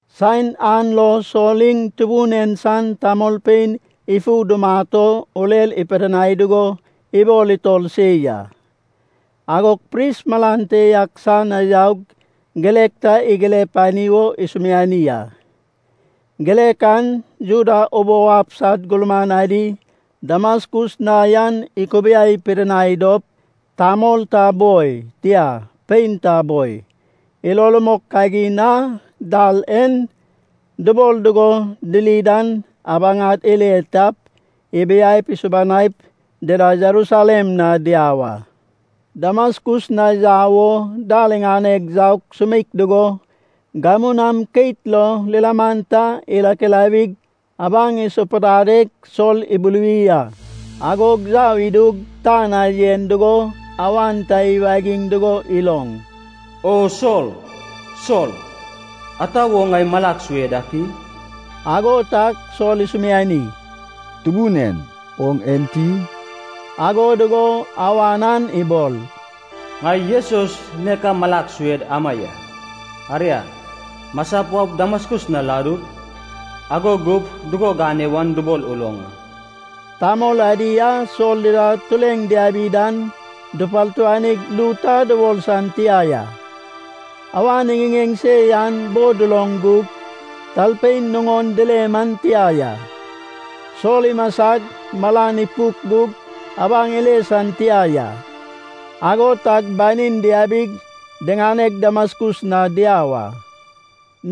Saen an lo Sol iŋ Tubun en san tamolpein ifu dumat o urer ipidinai dugo ibol itor se ya. Agog pris malan te ak san na yaug, girek ta igire pani wo isumiani a. Girek an Juda ubou ab sad gurman adi Damaskus na yan ikubiai pidinai dop, tamol ta boi, tia pein ta boi, ilo rumok kagin a “Dal En” dubol dugo diri dan abaŋad ile tap, ibiap isubanaip, dida Jerusalem na diau a. Damaskus na yau wo dal iŋaneg yaug sumeik dugo gamu nam keit lo lilaman ta irakilawig, abaŋ isapudadeg Sol ibuluwi a. Agog yau idug tan na yen dugo awan ta iwagiŋ dugo iloŋ, “O Sol! Sol! Ata wo ŋai malag sue dak i?” Ago tag Sol isumiani, “Tubun en oŋ enti?” Ago dugo awan an ibol, “Ŋai Jesus nek a malag sued ama ya. Aria, masap waup Damaskus na ladu. Ago gup dugo gane wan dubol uloŋ a.” Tamol adi a Sol dida tureŋ diabi dan dupartuanig ru ta dubol san tia ya. Awan iŋiŋeŋ se yan bo duloŋ gug talpein nuŋon dile man tia ya. Sol imasag malan ipuk gug abaŋ ile san tia ya. Ago tag banin diabig diŋaneg Damaskus na diau a.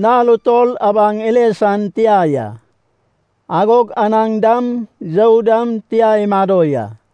Nal utol abaŋ ile san tia ya. Agog anaŋ dam, you dam tia imado ya.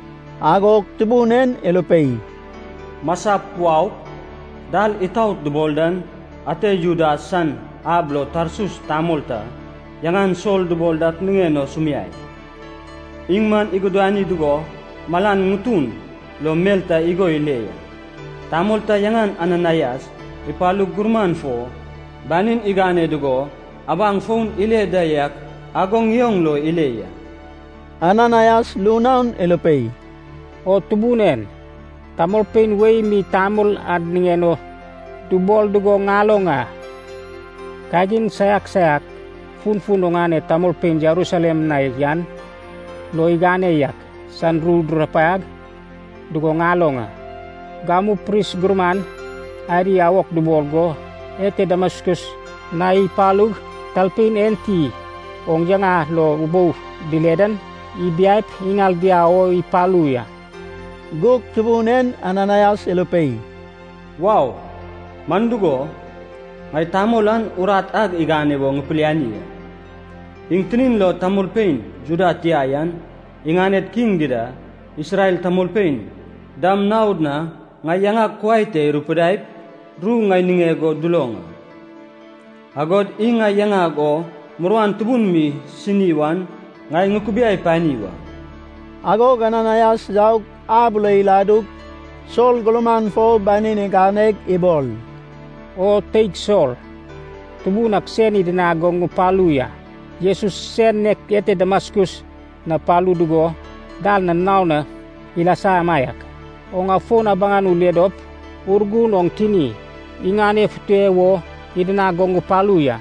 Agog Tubun en irupei, “Masap, waup, ‘Dal itaot’ dubol dan ate Judas san ab lo Tarsus tamol ta yaŋan Sol dubol dak niŋen o sumiai. Iŋ man igudani dugo malan ŋutun lo mel ta igo ile ya, tamol ta yaŋan Ananaias ipalug gurman fo banin igane dugo abaŋ fon ile da yak ago ŋioŋ lo ile ya.” Ananaias ru naon irupei, “O Tubun en, tamolpein wei mi tamol an niŋen o dubol dugo ŋaloŋ a. Kagin saiak saiak funfun oŋane tamolpein Jerusalem na yan lo igane yak san ru durupaiag dugo ŋaloŋ a. Gamu pris gurman adi awok dubol go ete Damaskus na ipalug, talpein enti oŋ yaŋa lo ubou dile dan ibiap iŋal diau o ipalu ya.” Gug Tubun en Ananaias irupei, “Wau! Man dugo, ŋai tamol an urat ag igane wo ŋipiliani a. Iŋ tinin lo tamolpein Juda tia yan, iŋaned kiŋ dida, Isrel tamolpein dam naod na ŋai yaŋag kuai te irupidaip ru ŋai niŋeg o duloŋ a. Agod iŋ ŋai yaŋag o muruan tubun mi isini wan ŋai ŋukubiai pani wa.” Agog Ananaias yaug ab lo iladug, Sol gurman fo banin iganeg ibol, “O teig Sol, Tubun ak sen idinag go ŋupalu ya. Jesus sen nek ete Damaskus na palu dugo dal na naon na ilasa amaiak, oŋ afon abaŋ ule dop Urgun oŋ tini iŋanefute wo idinag go ŋupalu ya.”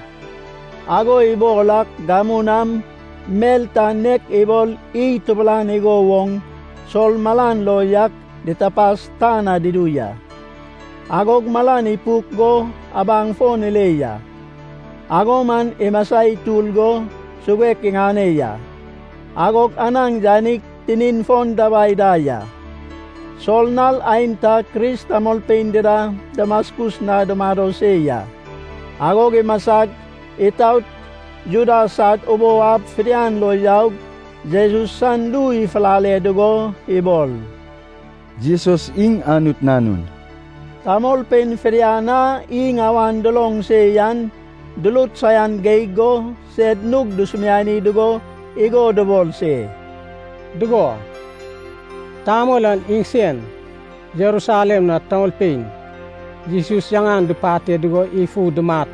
Ago ibol ak gamu nam mel ta nek ibol iy tubulan igo woŋ Sol malan lo yak ditapas tan na dudu ya. Agog malan ipuk go abaŋ fon ile ya. Ago man imasa itur go suguek iŋane ya. Agog anaŋ yanig tinin fon dabai da ya. Sol nal aenta Kris tamolpein dida Damaskus na dumado se ya. Agog imasag itaot Juda sad ubou ab fidian lo yaug, Jesus san ru ifulale dugo ibol, “Jesus iŋ Anut Nanun.” Tamolpein fidian a iŋ awan duloŋ se yan durut saian geig go sed nug dusumiani dugo igo dubol se, “Dugo, tamol an iŋsen Jerusalem na tamolpein Jesus yaŋan dupate dugo ifu dumat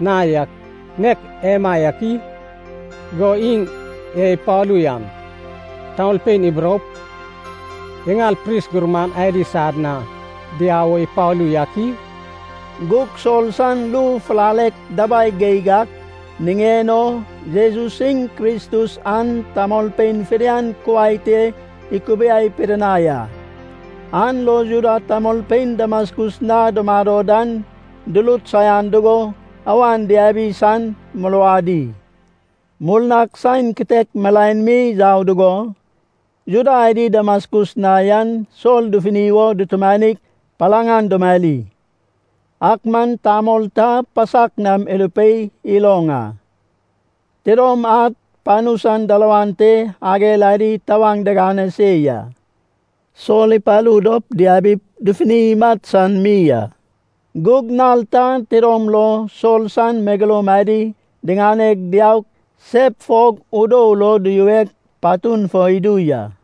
na yak nek emaiak i? Go iŋ e ipalu yan tamolpein iburoup, iŋal pris gurman adi sad na diau wo ipalu yak i?” Gug Sol san ru fulalek dabai geig ak niŋen o, Jesus iŋ Kristus an tamolpein fidian kuai te ikubiai pidinai a. An lo Juda tamolpein Damaskus na dumado dan durut saian dugo awan diabi san muruadi. Murnag saen kitek milaen mi yau dugo, Juda adi Damaskus na yan Sol dufuni wo dutumanig palaŋ an dumari. Ak man tamol ta pasak nam irupei iloŋ a. Tidom ad panu san dalawan te ager adi tawaŋ digane se ya. Sol ipalu dop diabip dufuni imat san mi a. Gug nal ta tidom lo Sol san megeloum adi diŋaneg, diaug sep fog udou lo duyuweg, patun fo idu ya.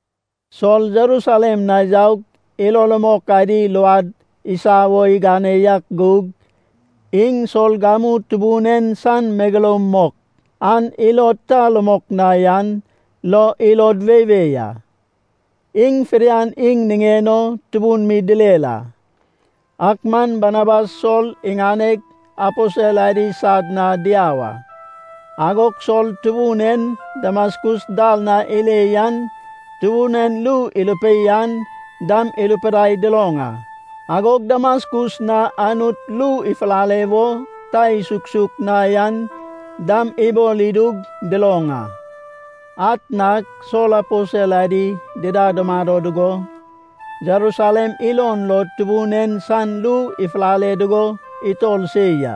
Sol Jerusalem na yaug ilo rumok adi luad isa wo igane yak gug, iŋ Sol gamu Tubun en san megeloum mok an ilod ta rumok na yan lo ilod weiwei a. Iŋ fidian iŋ niŋen o tubun mi direr a. Ak man Barnabas Sol iŋaneg aposel adi sad na diau a. Agog Sol Tubun en Damaskus dal na ile yan, Tubun en ru irupei an dam irupidai duloŋ a. Agog Damaskus na Anut ru ifulale wo ta isuksuk na yan dam ibol idug duloŋ a. Atnag Sol aposel adi dida dumado dugo, Jerusalem ilon lo Tubun en san ru ifulale dugo itor se ya.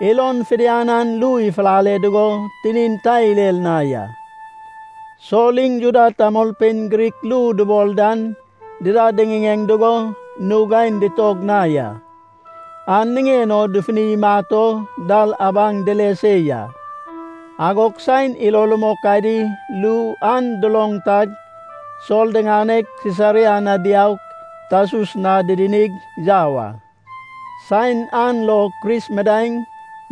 Ilon fidian an ru ifulale dugo tinin ta irer na ya. Sol iŋ Juda tamolpein Grik ru dubol dan dida diŋiŋeŋ dugo nug aen ditog na ya. An niŋen o dufuni imat o dal abaŋ dile se ya. Agog saen ilo rumok adi ru an duloŋ tag, Sol diŋaneg Sisaria na diaug Tarsus na didinig yau a. Saen an lo Kris midaeŋ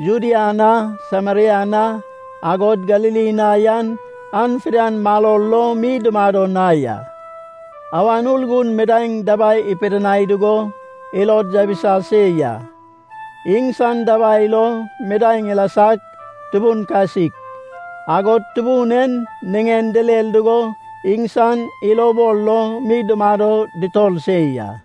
Judea na, Sameria na, agod Galili na yan an fidian maror lo mi dumado na ya. Awan Urgun midaeŋ dabai ipidinai dugo ilod yabisa se ya. Iŋsan dabai lo midaeŋ ilasag, tubun kasik. Agod Tubun en niŋen direr dugo iŋsan ilobol lo mi dumado dutor se ya.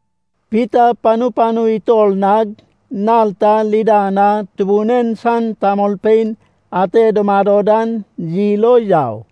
Pita panu panu itor nag, nal ta Lida na Tubun en san tamolpein ate dumado dan yil o yau.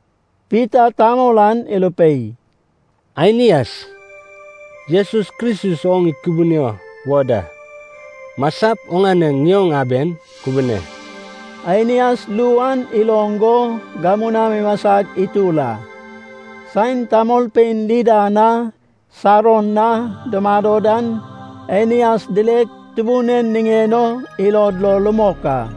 Pita tamol an irupei, “Ainias, Jesus Kristus oŋ ikubunio wo da. Masap, oŋane ŋioŋ aben kubune.” Ainias ru an iloŋ go gamu nam imasag itur a. Saen tamolpein Lida na, Saron na dumado dan Ainias dileg Tubun en niŋen o ilod lo rumok a.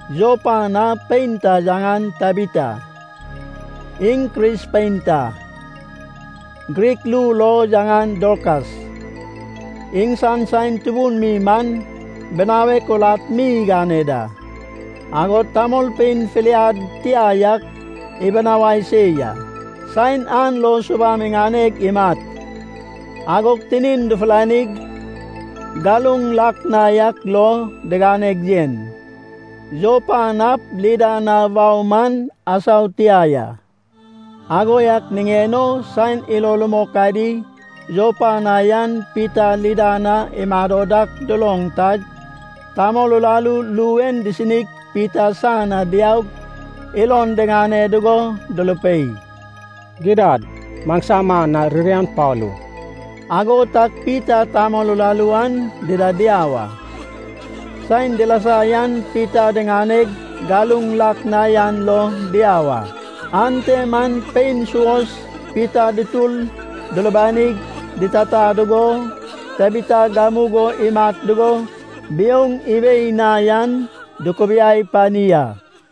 Jopa na pein ta yaŋan Tabita, iŋ Kris pein ta. (Grik ru lo yaŋan Dorkas). Iŋsan saen tubun mi man binawek urat mi igane da. Agod tamolpein filiad tia yak ibinawai se ya. Saen an lo subam iŋaneg imat, agog tinin dufulanig galuŋ lak na yak lo diganeg yen. Jopa nap Lida na wau man asau tia ya. Ago yak niŋen o saen ilo rumok adi Jopa na yan Pita Lida na imado dak duloŋ tag, tamol uraru ru en disinig Pita san na diaug ilon diŋane dugo durupei, “Gidad maŋsama na ririan palu.” Ago tag Pita tamol uraru an dida diau a. Saen dilasa yan Pita diŋaneg galuŋ lak na yan lo diau a. Ante man pein suos Pita dutur dulubanig ditata dugo, Tabita gamugo imat dugo biouŋ iwei na yan dukubiai pani a.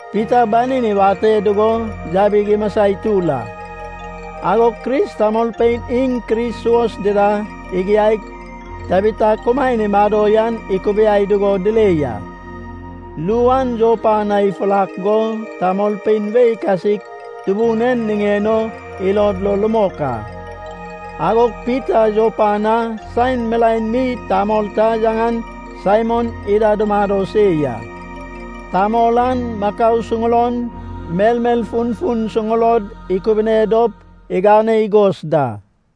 Pita banin iwate dugo yabig imasa itur a. Agog Kris tamolpein iŋ Kris suos dida igiaig, Tabita kumaen imado yan ikubiai dugo dile ya. Ru an Jopa na ifurak go, tamolpein wei kasik Tubun en niŋen o ilod lo rumok a. Agog Pita Jopa na saen milaen mi tamol ta yaŋan Saimon ida dumado se ya. Tamol an makau suŋulon, melmel funfun suŋulod ikubune dop igane igos da.